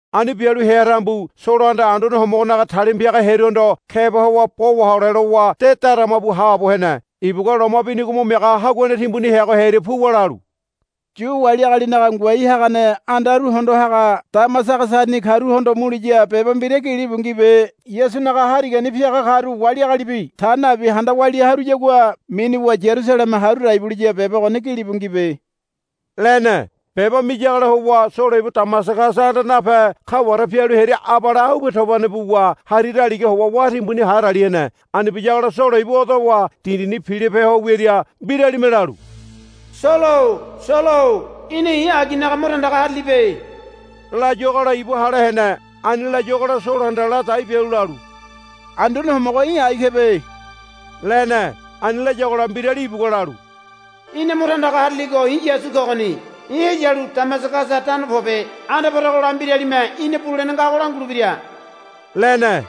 Ani bialu hea tambu Solohanda Anduane Homogonaga talima piaga hearuhondo keba howa bo wahole lowa de darama bu haabo hene. Ibugua loma binigo mo miaga haguane timbuni heago hearia puwa lalu, Yu wali agalinaga ngoai hagane andaru hondo haga Damasagasani karuhondo muliya beba mbira gilibu ngibe. Yasunaga Harigani piaga karu wali agalibi ta nabi handa walia haruyagua minuwa Yarusaleme haru dai buliya beba ogoni gilibu ngibe, lene. Beba miyagola howa Solo ibu Damasagasa anda nape kaware pialu hearia abale aube tobane buwa hari daligaha howa wá timbuni hadali hene. Ani biyagola Solo ibu odowa dindini pilope ho wiaria mbiralime lalu, Solo-o Solo-o í̠na i̱ aginaga mo tandaga harilibe, layuagola ibu hale hene. Ani layuagola Solohanda ladai bialu lalu, Anduane Homogo í̠ ai kebe, lene. Ani layagola mbirali ibugua lalu, Í̠na mo tandaga hariligo i̱ Yasu kogoni. Í̠ heyalu Damasagasa tano pobe. Anda poregola mbiralime í̠na bulene ngago langulebira, lene.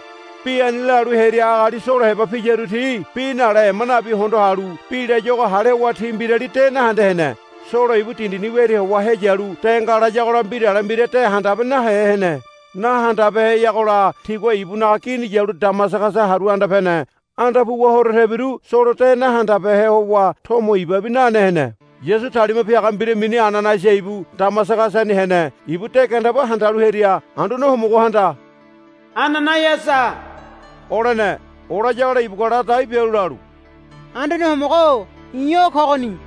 Bi ani lalu hearia agali Solo heba piyaru ti bi nale ema nabi hondo halu bi layuago hale howa ti mbirali de nahende hene. Solo ibu dindini wiaria howa heyalu de ngalayagola mbirale mbira de nahandabehe hene. Nahandabeheyagola tigua ibunaga gini yalu Damasagasa haru anda pene. Anda puwa horo tebiru Solo de nahandabehe howa tomo ibabi nane hene. Yasu talima piaga mbira mini Ananaiasa ibu Damasagasani hene. Ibu de gandeba handalu hearia Anduane Homogohanda, Ananaiasa, olene. Olayagola ibugua ladai bialu lalu, Anduane Homogo-o i̱ o kogoni,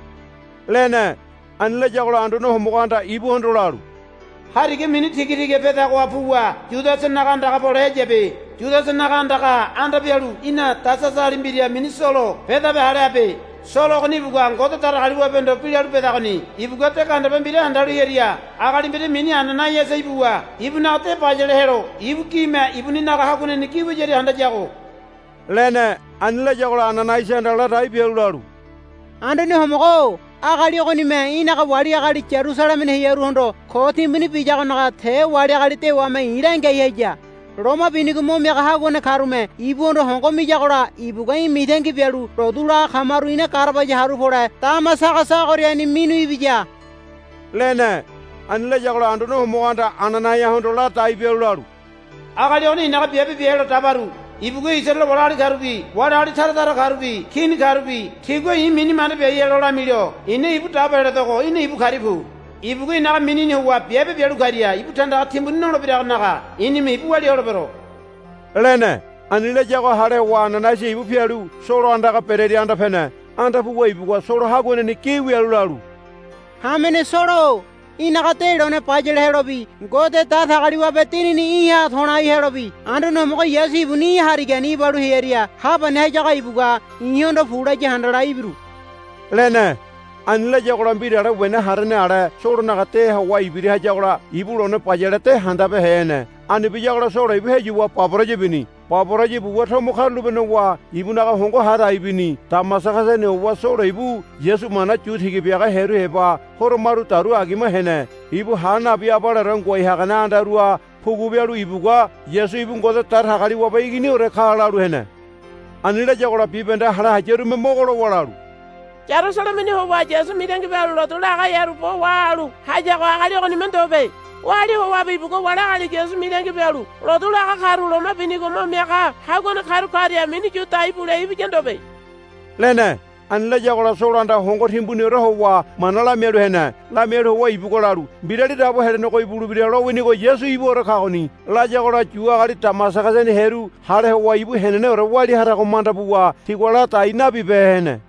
lene. Ani layagola Anduane Homogohanda ibuhondo lalu, Hariga mini Tigatiga pedagoha puwa Yudasanaga andaga pole heyabe. Yudasanaga andagaha anda pialu í̠na Tasasali mbira mini Solo bedabe hale habe. Solo ogoni ibugua Ngode Datagaliwabehondo bi lalu bedagoni. Ibugua de gandeba mbira handalu hearia agali mbira mini Ananaiasa ibuwa ibunaga de bayale helo ibu gime ibuninaga haguaneni wiyaria handayago, lene. Ani layagola Ananaiasahanda ladai bialu lalu, Anduane Homogo-o agali ogonime í̠naga wali agali Yarusalemeni hearuhondo ko timbuni biyagonaga te wali agali dewame i̱ langiai haya. Loma binigo mo miaga haguane karume ibuhondo hongo miyagola ibugua í̠ mitangi bialu lotu laga kamaru ina garabaya haru pole Damasagasa ogoriani minu ibiya, lene. Ani layagola Anduane Homogohanda Ananaiahondo ladai bialu lalu, Agali ogoni i̱naga biabe bia helo dabaru. Ibugua Isaraele wali agali karubi wali agali tara tara karubi kini karubi tigua i̱ mini manda biai helo lamilo i̱na ibu dabo heledogo í̠na ibu karia pu. Ibugua i̱naga minini howa biabe bialu karia ibu tandaga timbuni nolebiragonaga i̱nime ibu walia holebero, lene. Ani layago hale howa Ananaiasa ibu pialu Solo andaga berearia anda pene. Anda puwa ibugua Solo haguaneni gi wialu lalu, Hamene Solo-o í̠naga de lone bayale helobi Ngode Datagaliwabe Dinini í̠ha to̱lai helobi Anduane Homogo Yasu ibuni í̠ harigani ibalu heria ha pani hayago ibugua i̱hondo pu laya handala ibiru, lene. Ani layagola mbirale wena harene ale Solonaga deha howa ibira hayagola ibu lone bayale de handabehe hene. Ani biyagola Solo ibu heyuwa baboraya bini. Baboraya buwa tomo karulape nowa ibunaga hongo ha dai bini. Damasagasani howa Solo ibu Yasu mana yu tiga biaga hearu heba horo maru dauru agima hene. Ibu ha nabi abaleore ngoai hagane andaruha pugu bialu ibugua, Yasu ibu Ngode Datagaliwabe Iginiore ka, lalu hene. Ani layagola bibahende hale hayarume mogo lowa lalu, Yarusalemeni howa Yasu mitangi bialu lotu laga hearu bo wahalu hayago agali ogonime ndobe. Oali howabi ibugua wali agali Yasu mitangi bialu lotu laga karu loma binigo mo miaga haguane karu karia minu yu dai bule ibiya ndobe, lene. Ani layagola Solohanda hongo timbuniore howa mana lamialu hene. Lamialu howa ibugua lalu, Mbirali Dabo Helenego ibulebira lowinigo Yasu ibuore kagoni, layagola Yu agali Damasagasani hearu hale howa ibu heneneore walia harago manda buwa tigua ladai nabibehe hene.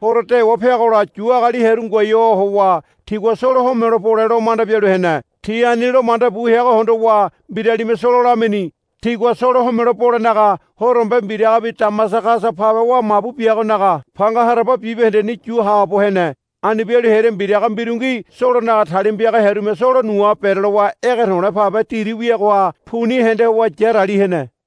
Horo dewa peagola Yu agali hearu ngoai howa tigua Solo homelo bole lo manda bialu hene. Ti ani lo manda bu heago hondowa mbiralime Solo lamini. Tigua Solo homelo bolenaga horombe mbiragabi Damasagasa pabe wa mabu biagonaga panga haraba bibahendeni yu haabo hene. Ani bialu hearia mbiraga mbirungi Solonaga talima piaga hearume Solo nuha berelowa ege to̱le̱ pabe diri wiagoha puni hende howa yarali hene.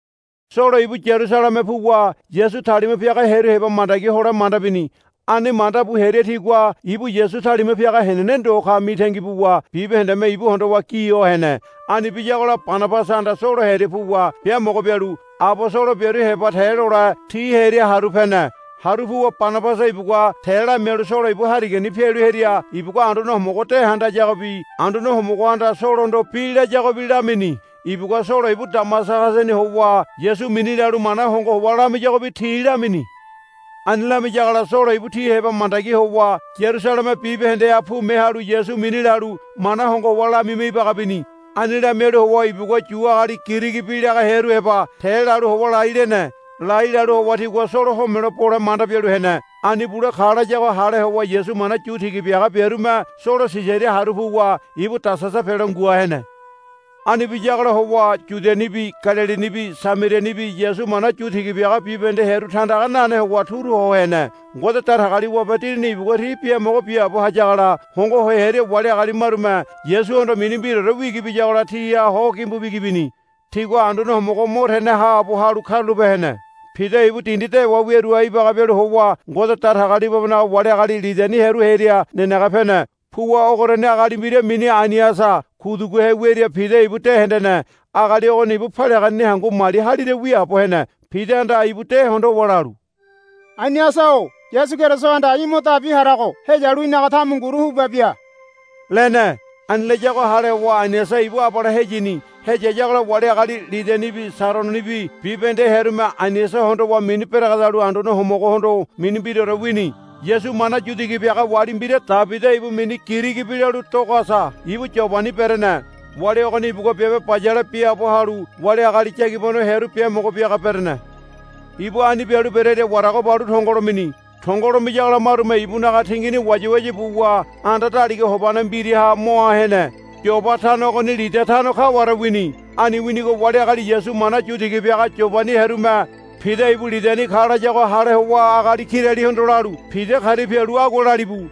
Solo ibu Yarusaleme puwa Yasu talima piaga hearu heba mandagi hole manda bini. Ani manda bu hearia tigua ibu Yasu talima piaga henene ndo ka mitangi buwa bibahendeme ibu hondowa gi ho hene. Ani biyagola Banabasahanda Solo hearia puwa biamogo bialu abosolo biaru heba te lole ti hearia haru pene. Haru puwa Banabasa ibugua te lamialu Solo ibu harigani pialu hearia ibugua Anduane Homogo de handayagobi Anduane Homogohanda Solohondo bi layagobi lamini. Ibugua Solo ibu Damasagasani howa Yasu mini lalu mana hongo howa lamiyagobi ti lamini. Ani lamiyagola Solo ibu ti heba mandagi howa Yarusaleme bibahendeha pume halu Yasu mini lalu mana hongo howa lamima ibaga bini. Ani lamialu howa ibugua Yu agali Girigi bi laga hearu heba te lalu howa lai lene. Lai lowa tigua Solo homelo bole manda bialu hene. Ani bule ka layago hale howa Yasu mana yu tiga biaga biarume Solo Sisaria haru puwa ibu Tasasa pelo ngua hene. Ani biyagola howa Yudianibi Galilinibi Samarianibi Yasu mana yu tiga biaga bibahende hearu tandaga nane howa turu ho hene. Ngode Datagaliwabe Dinini ibugua ti biamogo biaabo hayagola hongo ho hearia wali agali marume Yasuhondo mini mbiraore wigi biyagola tiha ho gimbu bigi bini. Tigua Anduane Homogo mo tene haabo halu karulape hene. Pida ibu dindi dewa wiaruha ibaga bialu howa Ngode Datagaliwabenaga wali agali Lidani hearu hearia nenege pene. Puwa ogoriani agali mbira mini Ainiasa kuduguhe wiaria Pida ibu de hendene. Agali ogoni ibu paliaganeni hangu mali halira wiaabo hene. Pidahanda ibu de hondowa lalu, Ainiasa-o Yasu Kerisohanda í̠ mo dabi harago heyalu í̠naga tamunguru huba bia, lene. Ani layago hale howa Ainiasa ibu abale heyini. Heyayagola wali agali Lidanibi Sarononibi bibahende hearume Ainiasa hondowa mini beregedalu Anduane Homogohondo mini mbiraore wini. Yasu mana yu tiga biaga wali mbira Tabida ibu mini Girigi bi lalu Dogasa ibu Yobani berene. Wali ogoni ibugua biabe bayale biaabo halu wali agali yagibano hearu biamogo biaga berene. Ibu ani bialu berearia warago balu tongolo mini. Tongolo miyagola marume ibunaga tingini wayawaya buwa anda daliga hobane mbiraha moa hene. Yoba tano ogoni Lida tano kaware wini. Ani winigo wali agali Yasu mana yu tiga biaga Yobani hearume Pida ibu Lidani ka layago hale howa agali kiralihondo lalu, Pida karia pialu agua lalibu.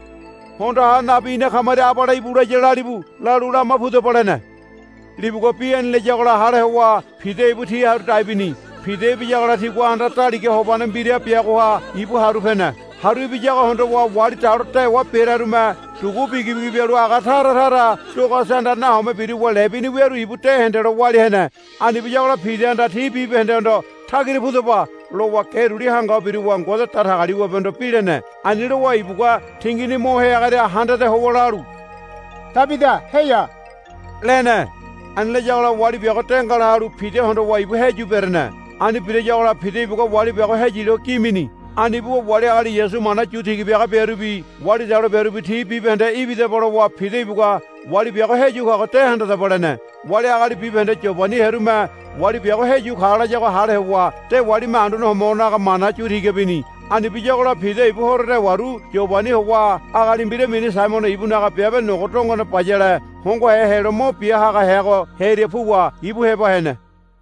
Hondo ha nabi ina kamaria abale íbu laya lalibu, lalu, Lama pudaba, lene. Libugua bi ani layagola hale howa Pida ibu ti haru dai bini. Pida ibiyagola tigua anda daliga hobane mbira biagoha ibu haru pene. Haru ibiyago hondowa wali dalo dewa berearume dugu bigibigi bialu aga taratara Dogasahanda nahome biruwa lebini wiaru ibu de hendelo walia hene. Ani biyagola Pidahanda ti bibahendehondo, Tagira pudaba, lowa ge duli hanga ho biruwa Ngode Datagaliwabehondo bi lene. Ani lowa ibugua tingini moa heagoria handade howa lalu, Tabida heya, lene. Ani layagola wali biago de ngalalu Pida hondowa ibu heyu berene. Ani birayagola Pida ibugua wali biago heyilo gi mini. Ani buwa wali agali Yasu mana yu tiga biaga biarubi wali dalo biarubi ti bibahende, Ibidaba, lowa Pida ibugua, Wali biago heyu kago de handadaba, lene. Wali agali bibahende Yobani hearume wali biago heyu ka layago hale howa dewalime Anduane Homogonaga mana yu tiga bini. Ani biyagola Pida ibu horo dewaru Yobani howa agali mbira mini Saimono ibunaga biabe nogo dongone bayale hongohe helo mo bia haga heago hearia puwa ibu heba hene.